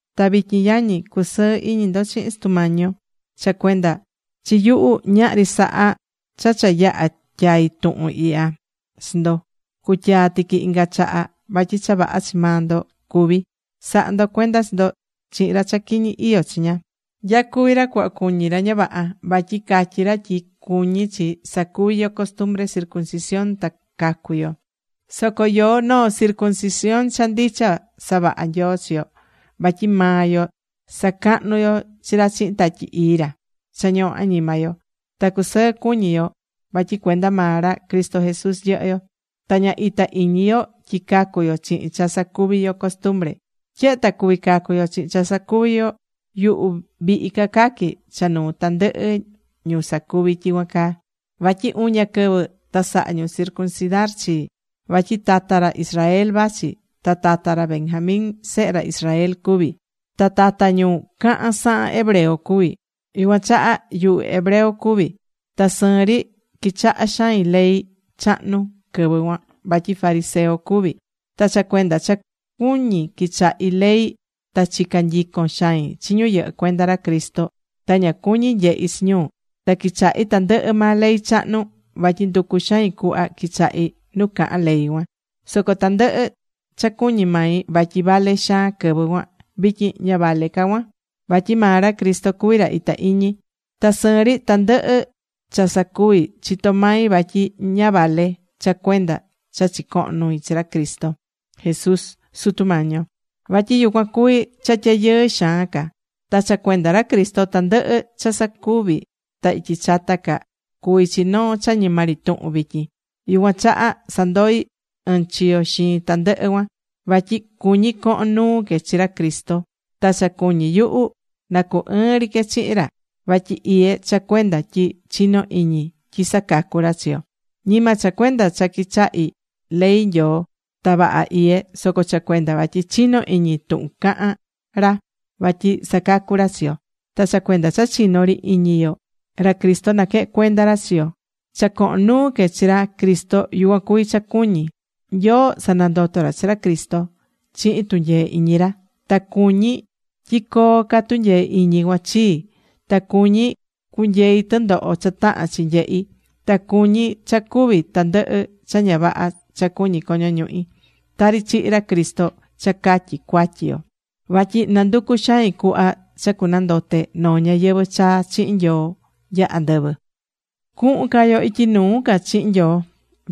Ta vityin yañi, cu̱sɨɨ iñi ndo chihin Sutu Mañi yo. Cha cuenda chi yuhu ñahri sahá cha cha yaha tyai̱ tuhun ihya chi ndo, cutyaa tiqui inga chaha. Vatyi cha vaha chi maa ndo cuví. Sa̱ha ndo cuenda chi ndo chihin ra cha quiñi iyó chiña. Nyacuví ra cuhva cuñí ra ña vaha. Vatyi catyí ra tyi cuñí chi sacuvi yo costumbre circuncisión ta cacu yo. Soco yoó noo circuncisión cha ndicha savaha̱ Nyoo chi yo. Vatyi maa yo sacahnú yo chi ra chihin Tatyi Ii ra cha ñohó añima yo. Ta cusɨɨ cuñí yo vatyi cuenda maa ra Cristo Jesús yɨhɨ́ yo. Ta ña itá iñi yo tyi cacu yo chihin cha sacuví yo costumbre. Tyehe ta cuví cacu yo chihin cha sacuví yo, yuhu vihi ca caquí cha nuu tandɨhɨ ñu sacuví tyicuan caa. Vatyi uña quɨvi ta saha̱ ñu circuncidar chii. Vatyi tata ra Israel vachi. Ta tata ra Benjamín sehe ra Israel cuví. Ta tata ñu cahán sahan hebreo cuví. Yucuan chaha yuhu hebreo cuví. Ta sɨɨn ri quichaha̱ xain ley chahnu quɨvɨ cuan, vatyi fariseo cuvi̱. Ta cha cuenda cha cuñi̱ quichahi̱ ley, ta chica̱n nyicon xain chi ñu yɨhɨ́ cuenda ra Cristo. Ta ña cuñi̱ nyehi chi ñu. Ta quichahi̱ tandɨhɨ maa ley chahnu, vatyi nducu̱ xain cuhva quichahí nu cahán ley cuan. Soco tandɨhɨ cha cuñi̱ mai vatyi vale xaan quɨvɨ cuan, vityin ña vale ca cuan. Vatyi maa ra Cristo cuví ra itá iñi. Ta sɨɨn ri tandɨhɨ cha sacuvi̱, chitó mai vatyi ña vale cha cuenda cha chicohón nui chi ra Cristo Jesús, Sutu Mañi yuhu. Vatyi yucuan cuví cha tyayɨɨ xaan ca. Ta cha cuenda ra Cristo tandɨhɨ cha sacuvi̱ ta ityi chata ca cuví chi noo cha ñima ri tuhun vityin. Yucuan chaha sandoi̱ ɨɨn chiyo xiin tandɨhɨ cuan. Vatyi cuñí cohon nuu que chi ra Cristo. Ta cha cuñí yuhu nacu ɨɨn ri que chihin ra. Vaha iyé cha cuenda tyi chinó iñi tyi sacacú ra chi yo. Ñima cha cuenda cha quichahí ley Nyoo ta vaha iyé, soco cha cuenda vatyi chinó iñi tuhun cahán ra, vatyi sacacú ra chi yo. Ta cha cuenda cha chinó ri iñi yo, ra Cristo naquehén cuenda ra chi yo. Cha cohon nuu que chi ra Cristo yucuan cuví cha cuñí. Nyoo sanandoto̱ ra chi ra Cristo chihin tunyee iñi ra. Ta cuñí tyi coo ca tunyee iñi cuan chii. Ta cuñí cunyeí tɨndoho cha tahán chi nyehí. Ta cuñí cha cúvi tandɨhɨ cha ña vaha cha cuñí coño ñuhi, tari chihi̱ ra Cristo cha catyi cuatyi yo. Vatyi nanducú xain cuhva cha cunandote noo ñayɨvɨ̱ chaa chihin Nyoo nya andɨvɨ.Cuhun ca yo ityi nuu ca chihin Nyoo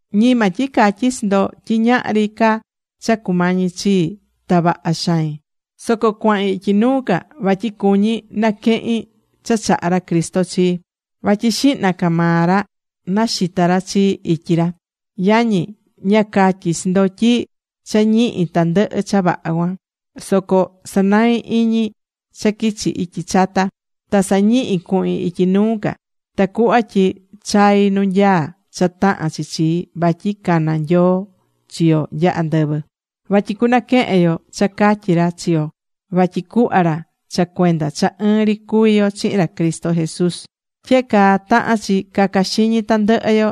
Ñima tyi catyí chi ndo tyi ñahri ca cha cumañí chii, ta vaha xain. Soco cuahin ityi nuu ca. Vatyi cuñí naquehin cha chahá ra Cristo chii. Vatyi xihna ca maa ra naxita ra chii ityi ra. Yañi, ña catyí chi ndo tyi cha ñihi̱ tandɨhɨ cha vaha cuan. Soco sanaí iñi cha quichi ityi chata. Ta sañihí cuhin ityi nuu ca. Tacuhva tyi chaí nu nyaá cha tahán chi chii. Vatyi caná Nyoo chi yo nya andɨvɨ. Vatyi cunaquehen yo cha catyí ra chi yo vatyi cuhva ra cha cuenda cha ɨɨn ri cuví yo chihin ra Cristo Jesús. Tyehe caa tahán chi caca xiñi tandɨhɨ yo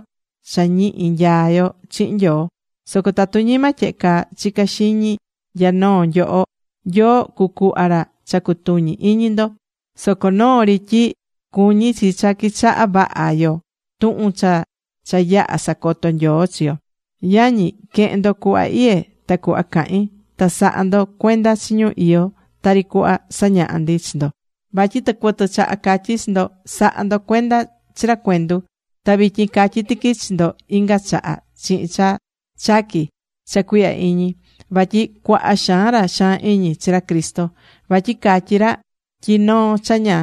cha ñihi nyaá yo chihin Nyoo. Soco tatu ñima tyehe caa chicá xiñi nya noo nyoho, Nyoo cucuhva ra cha cutuñí iñi ndo. Soco noo ri tyi cuñí chi cha quichahá vaha yo tuhun cha cha yaha sacoto̱ Nyoo chi yo. Yañi, que̱hen ndo cuhva iyé ta cuhva cahín. Ta sa̱ha ndo cuenda chi ñu iyó tari cuhva sañahá ndi chi ndo. Vatyi tɨcuɨtɨ chaha catyi̱ chi ndo, sa̱ha ndo cuenda chi ra cuendu. Ta vityin catyí tiqui chi ndo inga chaha chihin cha chaquí cha cuihya iñi, vatyi cuaha xaan ra xaan iñi chi ra Cristo. Vatyi catyí ra tyi noo cha ña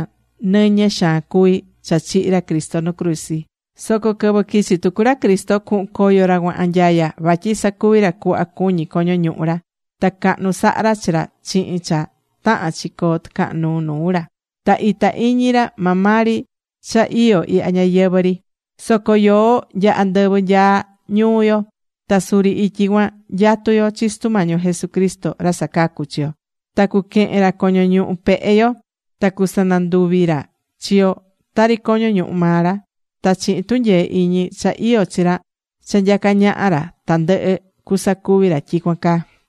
nɨñɨ xaan cuví cha chihi̱ ra Cristo nu cruzi. Soco quɨvɨ quichi tucu ra Cristo, cuhun coyo ra cuan anyaya. Vatyi sacuví ra cuhva cuñí coño ñuhu ra. Ta cahnu sahá ra chi ra chihin cha tahán chi coo tɨcahan nuu nuu ra. Ta itá iñi ra maa maa ri cha iyó ihya ñayɨvɨ̱ ri. Soco yoó nya andɨvɨ nyaá ñuu yo. Ta suri ityi cuan nyatú yo chi Sutu Mañi yo Jesucristo, ra sacacú chi yo. Ta cuquehen ra coño ñuhu pehe yo. Ta cusananduvi ra chi yo tari coño ñuhu maa ra. Ta chihin tunyee iñi cha iyó chi ra cha nyacá ñaha ra tandɨhɨ, cusacuvi ra tyicuan caa.